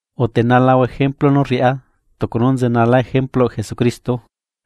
Utenalahua ejemplu nú rriꞌá, tucu nú nzenala ejempluꞌ Jesucristo.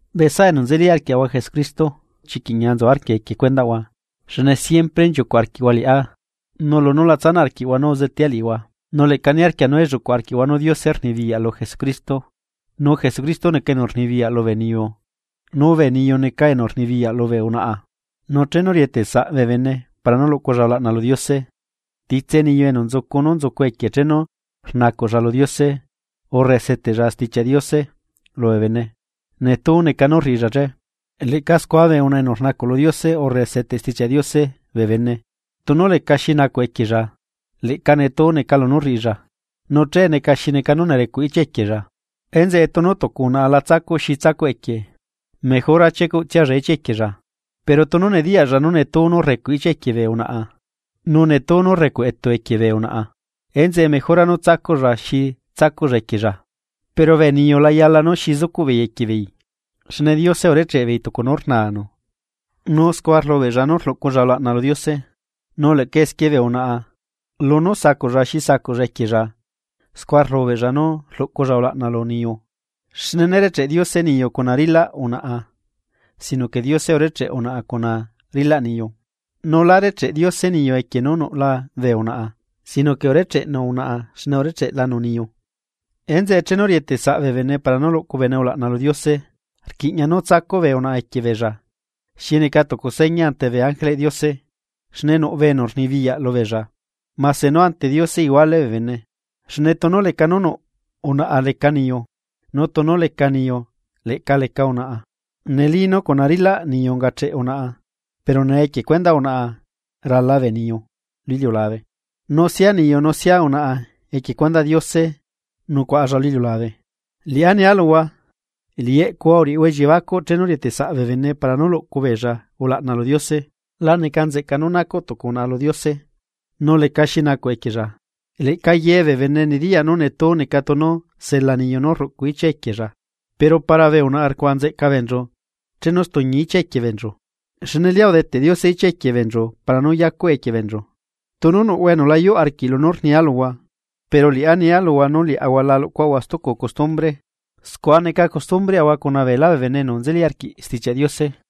Bee saꞌa enu nzeli arquiaꞌahua Jesucristo chiquiꞌ ñia nzu arquia equie cuendaꞌhua xne siempre nchiucuꞌ arquiꞌhua liꞌá nu lunú la tsanaꞌ arquiꞌhua nú uzetea liꞌihua. Nu leꞌca niarquia nú elluꞌcuꞌ arquiꞌhua nú Diose rnibiyaꞌ lu Jesucristo nu Jesucristo neca enu rnibiyaꞌ lubee niyu nu bee niyu neca enu rnibiyaꞌ lubee unaꞌa. Nu chenu rietesaꞌ bee bene para nú luꞌcu beella ulaꞌna lu Diose, titse niyu enu nzucu nú nzucu equie chenu rnacuꞌlla lu Diose urre seteꞌlla Stichiaꞌ Diose lubee bene netuu neca nú rriꞌilla che. Leꞌca scua bee unaꞌa enu rnacuꞌ lu Diose urre seteꞌ Stichiaꞌ Diose bee bene, tunu lecaxi nacuꞌ equiella, leꞌca netuu neca lunú rriꞌilla. Nu che neca xi neca nú nerecuꞌ ichia equiella. Enzeꞌe tunu tucu unaꞌa la tsacuꞌ xi tsacuꞌ equie, mejora chiecuꞌtsialla ichia equiella. Pero tunu nediyaꞌlla nú netuu nú recuꞌ ichia equie bee unaꞌa, nu netú nú rrecuꞌ etu equie bee unaꞌa, enzeꞌe mejora nú tsacuꞌlla xi tsacuꞌlla equiella. Pero bee niyu la yala nú xi zucuꞌ beei equie beei, xne Diose urecheꞌ beei tucu nú rnanu, nu scua rlubeꞌlla nú rluꞌculla ulaꞌna lu Diose. Nu leꞌca esquie bee unaꞌa lunú sacuꞌlla xi sacuꞌlla equiella scua rlubeꞌlla nú rluꞌculla ulaꞌna lu niyu. Xne nérecheꞌ Diose niyu cuna rilaꞌ unaꞌa, sino que Diose urecheꞌ unaꞌa cuna rilaꞌ niyu. Nu lá recheꞌ Diose niyu equie nú nuꞌla bee unaꞌa sino que urecheꞌnu unaꞌa xne urecheꞌlanu niyu. Enzeꞌe chenu rietesaꞌ bee bene para nú luꞌcu bene ulaꞌna lu Diose, rquiꞌña nú tsacuꞌ bee unaꞌa equie beella xi neca tucu seña ante bee ángeleꞌ Diose, xne nuꞌ enu rnibiyaꞌ lubeella. Mase nú ante Diose iguale bee bene, xne tunu leca nú nuꞌ unaꞌa leca niyu, nu tunu leca niyu leꞌca leca unaꞌa. Neli nú cuna rilaꞌ niyu ungacheꞌ unaꞌa pero nee equie cuendaꞌ unaꞌa rala bee niyu lu iliulabe, nu sia niyu nu sia unaꞌa equie cuendaꞌ Diose nucuaꞌalla lu iliulabe. Liꞌá nia luhua, liꞌi eꞌcuhua uriꞌihua elliebacuꞌ chenu rietesaꞌ bee bene para nú luꞌcu beella ulaꞌna lu Diose, la neca nzeꞌca nú nacuꞌ tucu unaꞌa lu Diose, tunu lecaxi nacuꞌ equiella. Leꞌca ye bee bene nediyaꞌ nú netu neca tunu sela niyu nú rruꞌcu ichia equiella. Pero para bee unaꞌa rcuaꞌa nzeꞌca beenchu chenu stuñi ichia equie beenchu, xne lia udeteꞌ Diose ichia equie beenchu para nú yacuꞌe equie beenchu. Tunu nuꞌhua enu layuꞌ arquiꞌ lunú rnia luhua, pero liꞌá nia luhua nú liaꞌahua la luꞌcuaꞌahua stucu custumbre, scua neca custumbreꞌahua cuna beela bee bene enu nzeli arquiꞌ Stichiaꞌ Diose.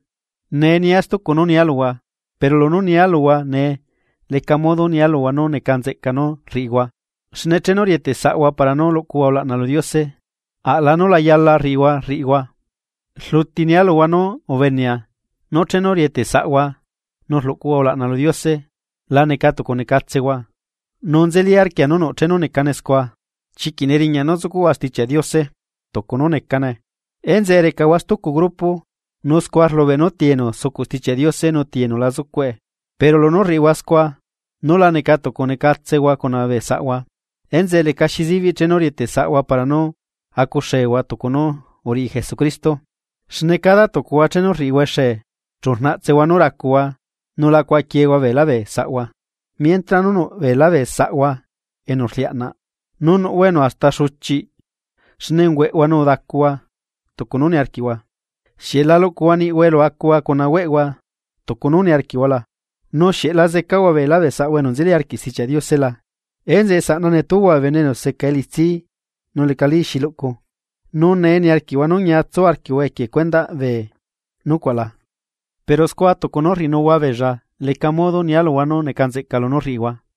Nee nia stucu nú nia luhua, pero lunú nia luhua nee leca modo nia luhua nú neca nzeꞌca nú rriꞌihua xne chenu rieteꞌsaꞌhua para nú luꞌcuhua ulaꞌna lu Diose aꞌla nú la yala riꞌihua rriꞌihua. Rluti nia luhua nú ubenea nú chenu rieteꞌ saꞌhua nú rluꞌcuhua ulaꞌna lu Diose la neca tucu necatsehua, nu nzeli arquia nú nuꞌ chenu necane scua. Chiquiꞌ neriñaꞌ nú zucuꞌhua Stichiaꞌ Diose tucu nú necane, enzeꞌe recahua stucu grupo, nu scua rlubeꞌ nú ti enu sucuꞌ Stichiaꞌ Diose nu ti enu la zucuꞌe. Pero lunú rriꞌihua scua, nu la neca tucu necatsehua cuna bee saꞌhua, enzeꞌe lecaxi sibiꞌ chenu rieteꞌ saꞌhua para nú acuxehua tucu nú uriꞌi Jesucristo. Xne cada tucuhua chenu rriꞌihua exee, chu rnaꞌtsehua nú racuhua nu la cuaꞌaquiehua beelá bee saꞌhua, mientra nú nuꞌ beelá bee saꞌhua enu rliaꞌnaꞌ, nu nuꞌhua enu hasta xuchiꞌhua xne ungueꞌhua nu udacuhua tucu nú niarquiꞌhua. ¿Xieꞌ la luꞌcuhua niꞌhua elu acuhua cuna hueꞌhua tucu nú niarquiꞌhua la? ¿Nu xieꞌ la zecahua beela bee saꞌhua enu nzeli arquiꞌ Stichiaꞌ Diose la? Enzeꞌe saꞌna netuhua bee bene enu seca elitsi nu lecali xi luꞌcu. ¿Nu nee niarquiꞌhua nú ñia tsu arquiꞌhua equie cuendaꞌ bee nucuaꞌ la? Pero scua tucu nú rriꞌinuhua beella leca modo nia luhua nú neca nzeꞌca lunú rriꞌihua.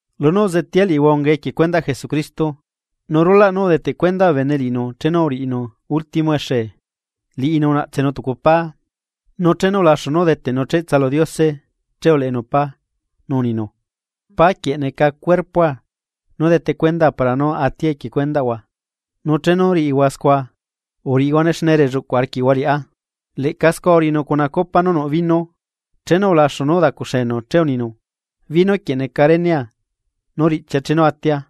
Lunú uzetea liꞌihua ungae equie cuendaꞌ Jesucristo. Nu rulaꞌ nú udeteꞌ cuenda bene liꞌinu chenu uriꞌinu último exe, liꞌinu unaꞌtsenu tucu pá. Nu chenu ulaxu nú udeteꞌnu cheꞌtsa lu Diose che uleꞌenu pá, nu uninu: “Pá quieꞌ neca cuerpoa nú dete cuendaa para nú atia equie cuendaꞌhua. Nu chenu riꞌihua scua, uriꞌihuane xne relluꞌcuꞌ arquiꞌhua liꞌá.” Leꞌca scua uriꞌinu cuna copa nú nuꞌ viño, chenu ulaxu nú udacuxenu che uninu: “Viño quieꞌ neca renea nú riꞌchia chenu atia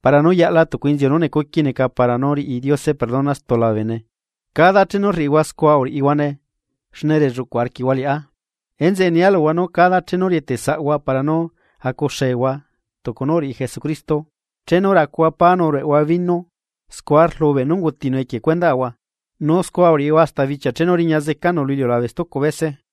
para nú yaꞌla tucu inziu nú necuqui neca para nú riꞌi Diose perdona stula bee bene, cada chenu riꞌihua scua uriꞌihuane xne relluꞌcu arquiꞌhua liꞌá.” Enzeꞌe nia luhua nú cada chenu rieteꞌ saꞌhua, para nú acuxehua tucu nú uriꞌi Jesucristo, chenu racuhua pá nu rueꞌhua viño scua rlubeꞌ nú ungutinu equie cuendaꞌhua. Nu scua uriꞌihua hasta bichia chenu riña zecanu lu iliulabe stucu bese.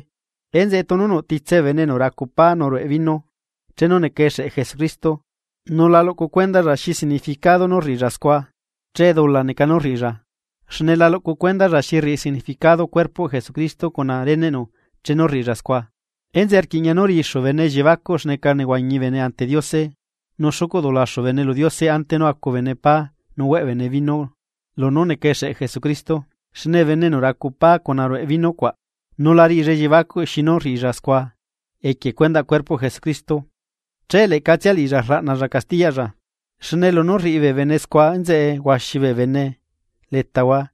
Enzeꞌe tunu nuꞌ titse bee bene enu racu pá nu rueꞌ viño chenu neca exeꞌ Jesucristo nu la luꞌcu cuendalla xi significado nú rriꞌilla scua, che dula neca nú rriꞌilla, xne la luꞌcu cuendalla xi rriꞌi significado cuerpoꞌ Jesucristo cuna reneꞌnu chenu rriꞌilla scua. Enzeꞌe rquiꞌña nú riꞌixu bene elliebacuꞌ xneca nehuañi bene ante Diose nu xucuꞌ dulaxu bene lu Diose ante nú acu bene pá nu hueꞌ bene viño lunú neca exeꞌ Jesucristo. Xne bene enu racu pá cuaꞌ nu rue viño cuaꞌ nu la riꞌilla elliebacuꞌ xinu rriꞌilla scua, equie cuendaꞌ cuerpoꞌ Jesucristo, che leꞌcatsia liꞌilla rlaꞌnalla castiyaꞌlla. Xne lunú rriꞌi bee bene scua enzeꞌe huaxi bee bene letahua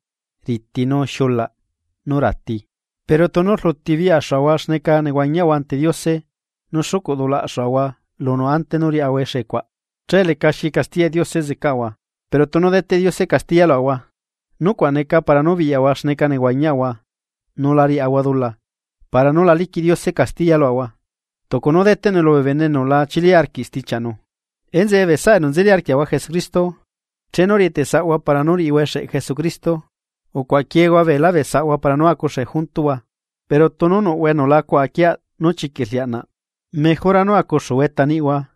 riti nu xiulaꞌ nu rati. Pero tunu rluti biꞌyaxuhua xneca nehuañihua ante Diose nu xucuꞌ dulaꞌxuaꞌahua lunu ante nú riaꞌahua execuaꞌ, che lecaxi castiyaꞌ Diose zecaꞌahua. Pero tunu deteꞌ Diose castiya luaꞌahua, nucuaꞌ neca para nú biꞌyaꞌahua xneca nehuañiaꞌahua nu la riaꞌahua dula, para nú la liquiꞌ Diose castiya luaꞌahua, tucu nú deteꞌnue lubee bene enu la chili arquiꞌ stichiaꞌnu. Enzeꞌe bee saꞌa enu nzeli arquiaꞌahua Jesucristo, chenu rieteꞌ saꞌhua para nú riꞌihua exeꞌ Jesucristo, ucuaꞌa quiehua beelá bee saꞌhua para nú acuxe juntuhua. Pero tunu nuꞌhua enu la cuaꞌa quieaꞌ nú chiquiꞌ rliaꞌnaꞌ mejora nú acuxuhua eta niꞌhua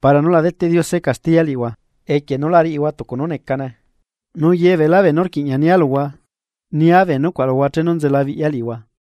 para nú la deteꞌ Diose castiya liꞌihua equie nú la riꞌihua tucu nú necane. Nu ye beelá beenú rquiꞌña nia luhua, nia bee nucuaꞌ luhua chenu nzelabiꞌya liꞌihua.